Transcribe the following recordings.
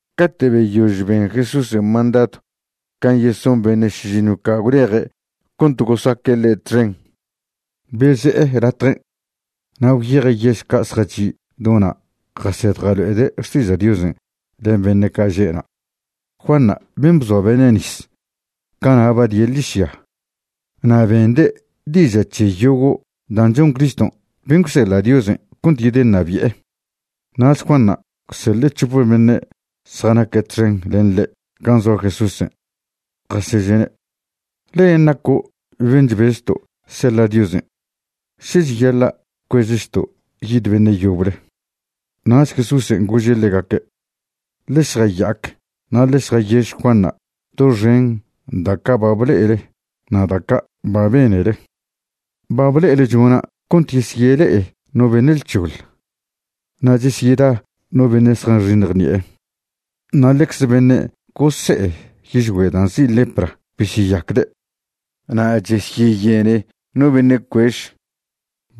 Cate' beyož ben Jesúsen' mandadw can' yeson beṉe' šižiṉw ca' gwleje' cont gosaque' ḻe' txen, beze'e latjen'. Na' gwyeje' yež ca' zjachi' do na' jased jalo'ede' xtiža' Diosen' len beṉe' ca' že'na'. Juanṉa' ben' bzoe' beṉe' nis, cana' ba die' ḻižya. Na' bende' diža' c̱he yogo' dan' chon Criston' ben' gwseḻa' Diosen' cont yedeṉabi'e. Nach Juanṉa' gwseḻe' c̱hope beṉe' zjanaque' txen len ḻe' gan' zoa Jesúsen', jaseže'ne': ―¿Len' naco' ben' chbezto' seḻa' Diosen', še cheyaḻa' cuezchto' yid beṉe' yoble? Nach Jesúsen' gože' ḻegaque': ―Ḻe šjaya'ac na' ḻe šjayež Juanṉa' doxen da' ca' ba ble'ele na' da' ca' ba benele. Ba ble'ele chona' cont chesyele'e no beṉe' lc̱hoḻ, na' chesyeda no beṉe' zjanxiṉj ṉi'e. Na' ḻecze beṉe' gose'e yižgüe' dan' nzi' lepra besyeyacde', na' chesyeyene no beṉe' cuež.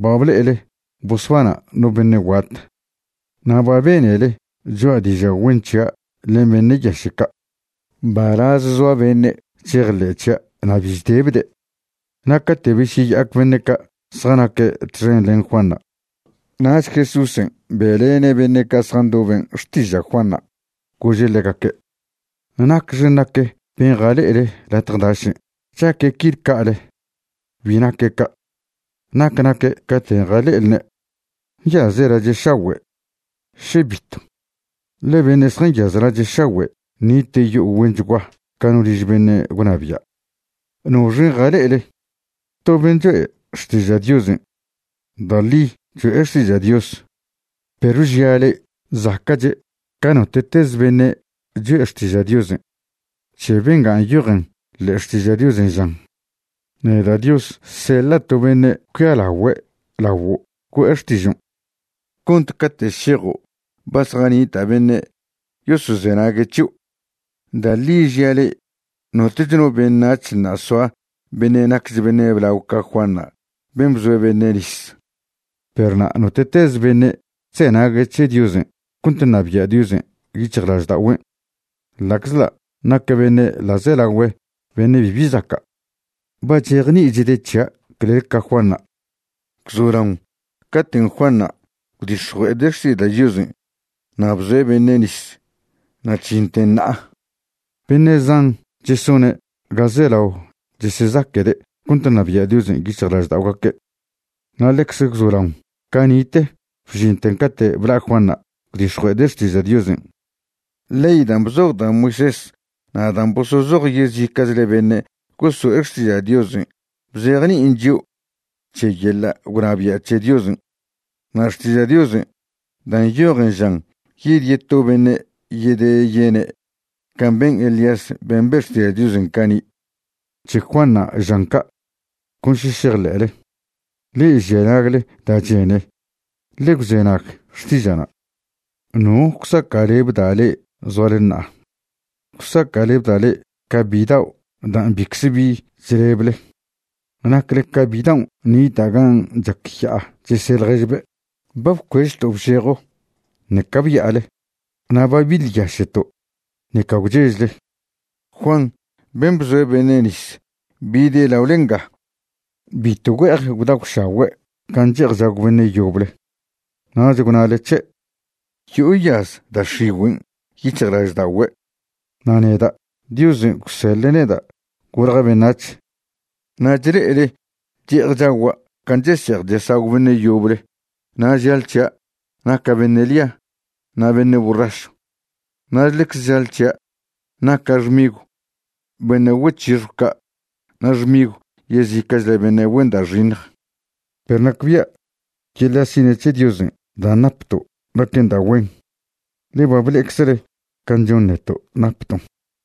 Ba ble'ele bosbana' no beṉe' guat, na' ba benele choa' diža' güen c̱hia' len beṉe' yaše' ca'. Mbalaz zoa beṉe' chejḻe'e c̱hia' na' bi chdebde'. Na' cate' besyeya'ac beṉe' ca' zjanaque' txen len Juanṉa', nach Jesúsen' be'lene' beṉe' ca' zjandoben' xtiža' Juanṉa', gože' ḻegaque': ―¿Nacxe nac ben' jale'ele latje dašen'? ¿Chaque' quil ca'ale? Bi naque' ca'. ¿Nac naque' caten' jale'elne'? ¿Nyaze' lache' šagüe'? ¿še bitw? ḻe beṉe' zjanyaz lache' šagüe' nite' yo'o güenchgua ca no liž beṉe' gwnabia'. ¿Noxen' jale'ele? ¿to ben' choe' xtiža' Diosen'? Da' ḻi cho'e xtiža' Dios, perw žia' le'e, zaca'che' ca note'teze beṉe' choe' xtiža' Diosen'. C̱he benga nyojen ḻe'e Xtiža' Diosen', žan: Neda' Dios seḻa' to beṉe' cuialagüe' laguo' güe'e xtižon' cont cate' šejo' ba zjanita' beṉe' yosozenague' c̱hio'. Da' ḻi žia' le'e notoch no beṉac̱h ṉa' soa beṉe' naquech beṉe' blao ca Juanṉa' ben' bzoe' beṉe' nis. Perw na' note'tez beṉe' chzenague' c̱he Diosen' cont ṉabia' Diosen' yic̱hjlažda'ogüen', ḻa'czḻa' naque' beṉe' ḻa'zelagüe beṉe' bibi zaca', ba chejni'ichde' c̱hia' clel ca Juanṉa'. ’Gwzolaon caten' Juanṉa' gwdix̱jue'ede' xtiža' Diosen' na' bzoe' beṉe' nis na' chžinten ṉa'a, beṉe' zan chesone' ga zelao chesezaquede' cont ṉabia' Diosen' yic̱hjlažda'ogaque'. Na' ḻecz gwzolaon cani'te bžinten cate' bla' Juanṉa' gwdix̱jue'ede' xtiža' Diosen', ley dan' bzoj da' Moisés na' dan' bosozoj yezica'chle beṉe' goso'e xtiža' Diosen' bzejni'in chio' c̱he yeḻa' gwnabia' c̱he Diosen'. Na' Xtiža' Diosen' dan' nyojen žan yid yeto beṉe' yedeyene' can' ben Elías ben' be' xtiža' Diosen' cani'. C̱he Juanṉa' žan ca', con še šejḻe'le. Le'e žia nagle da' chene, ḻe gwzenag xtiža'na'. ’¿No gwsaca'lebda' le'e zoale ṉa'a? Gwsaca'lebda' le'e ca bidao' dan' bicze bi chlebele. Nacle ca bidaon' nita' gan' chac ya'a chese' ḻježbe': “Ba bcuežto' bžejo, ṉeca bya'ale, na' ba biḻyaše'to', ṉeca gwchežle.” Juan ben' bzoe' beṉe' nis bide' laole nga, bitw güe'ej gwdagwšagüe' can' chese'ej chesagw beṉe' yoble, nach gwnale c̱he': “Yo'o yaz da' x̱igüen' yic̱hjlažda'ogüe'.” Na' neda', Diosen' gwseḻe' neda' golja' beṉac̱h, na' chle'ele che'ej chagua' can' chese'ej chesagw beṉe' yoble, na' žale c̱hia' naca' beṉe' ḻia na' beṉe' borrašw. Na' ḻecze žale c̱hia' naca' xmigw beṉe' güec̱hixjw ca' na' xmigw yezica'chle beṉe' güen da' xiṉj. Perw nacbia' yeḻa' sina' c̱he Diosen' dan' napto' naquen da' güen, ḻe ba ble'eczele can' chon neto' napton'.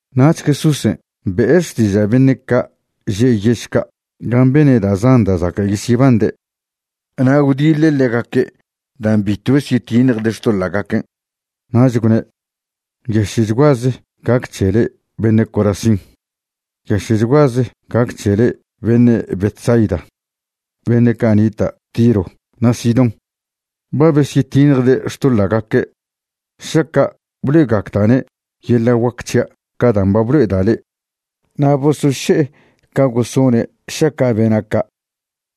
Nach Jesúsen' be'e xtiža' beṉe' ca' že' yež ca' gan' bene' da' zan da' zaca' yesyebande', na' gwdiḻe' ḻegaque' dan' bitw besyetiṉjde' xtoḻa'gaquen'. Nach gwne': ―¡Nyaše'chguaze gac c̱he le'e beṉe' Corazín! ¡Nyaše'chguaze gac c̱he le'e beṉe' Betsaida! Beṉe' ca' nita' Tiro na' Sidón ba besyetiṉjde' xtoḻa'gaque' šaca' blo'egacda'ne' yeḻa' guac c̱hia' ca dan' ba blo'eda' le'e. Na' bosoše'e ca gosone' šaca' bena' ca',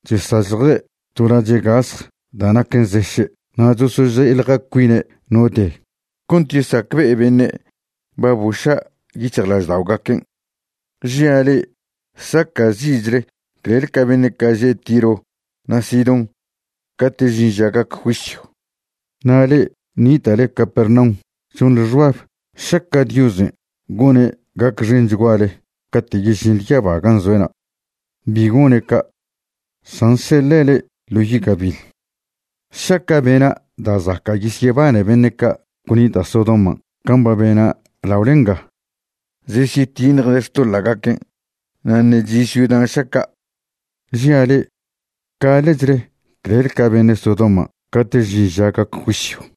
chesazḻje' to lache' gasj da' naquen zeše' na' chosože'eḻja cuine' no de cont yesacbe'e beṉe' ba boša' yic̱hjlažda'ogaquen'. Žia' le'e, saca'zi'chle clel ca beṉe' že' Tiro na' Sidón cate' žin ža gac juisyw. Na' le'e nita'le Capernaum chonḻe xbab šeca Diosen' gone' gacxenchguale cate' yežinḻe yaba gan' zoe'na'. Bi gone' ca', san seḻe' le'e ḻo yi' gabiḻ. Šeca' bena' da' zaca' yesyebane beṉe' ca' gwnita' Sodoman' can' ba bena' laole nga, zesyetiṉjde' xtoḻa'gaquen', na' ṉe' chi' ciudan' šeca'. Žia' le'e, gaḻe'chle clel ca beṉe' Sodoman' cate' žin ža gac juisyw.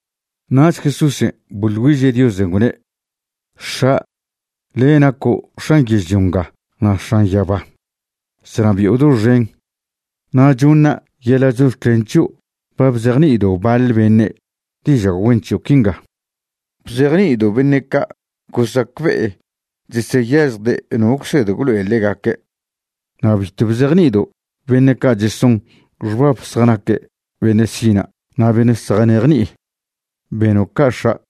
Nach Jesúsen' boḻ güiže' Diosen', gwne': ―X̱a', le' naco' X̱an yežlio nga na' X̱an yaba, chnabi'o doxen. Na' choṉa' yeḻa' chox̱clen c̱hio' ba bzejni'ido' baḻ beṉe' diža' güen c̱hio' quinga. Bzejni'ido' beṉe' ca' gosacbe'e cheseyažjde' no gwsed gwlo'e ḻegaque'. Na' bitw bzejni'ido' beṉe' ca' cheson xbab zjanaque' beṉe' sina' na' beṉe' zjanejni'i. Beno' ca' X̱a',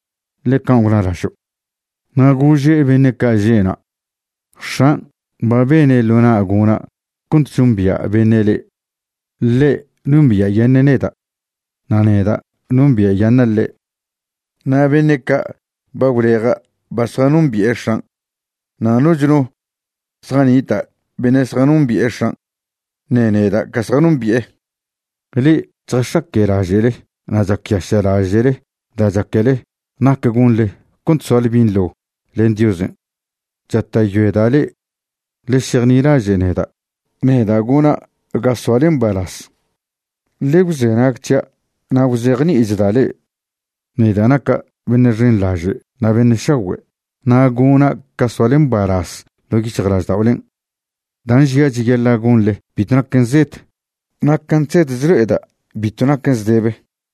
ḻe can' gwnalažo'. Na' gože' beṉe' ca' že'na': ―X̱an' ba bene' ḻo na' gona' cont chombia' beṉe' ḻe'. Ḻe' nombia'yaṉe' neda', na' neda' nombia'yaṉa' ḻe'. Na' beṉe' ca' ba gwleja' ba zjanombi'e X̱an'. Na' noch no zjanita' beṉe' zjanombi'e X̱an', ṉe neda' ca zjanombi'e. Le'e chjax̱aque'laže'le na' chacyaše'laže'le da' chaquele nac gonḻe cont soale binḻo len Diosen', chata'yoeda' le'e, ḻe šejnilaže' neda'. Neda' gona' ga soale mbalaz. Ḻe gwzenag c̱hia' na' gwzejni'ichda' le'e. Neda' naca' beṉe' xenḻaže' na' beṉe' šagüe' na' gona' ca soale mbalaz ḻo' yic̱hjlažda'olen'. Dan' žia' cheyaḻa' gonḻe bitw naquen zed, na' can' chsed chlo'eda' bitw naquen zdebe.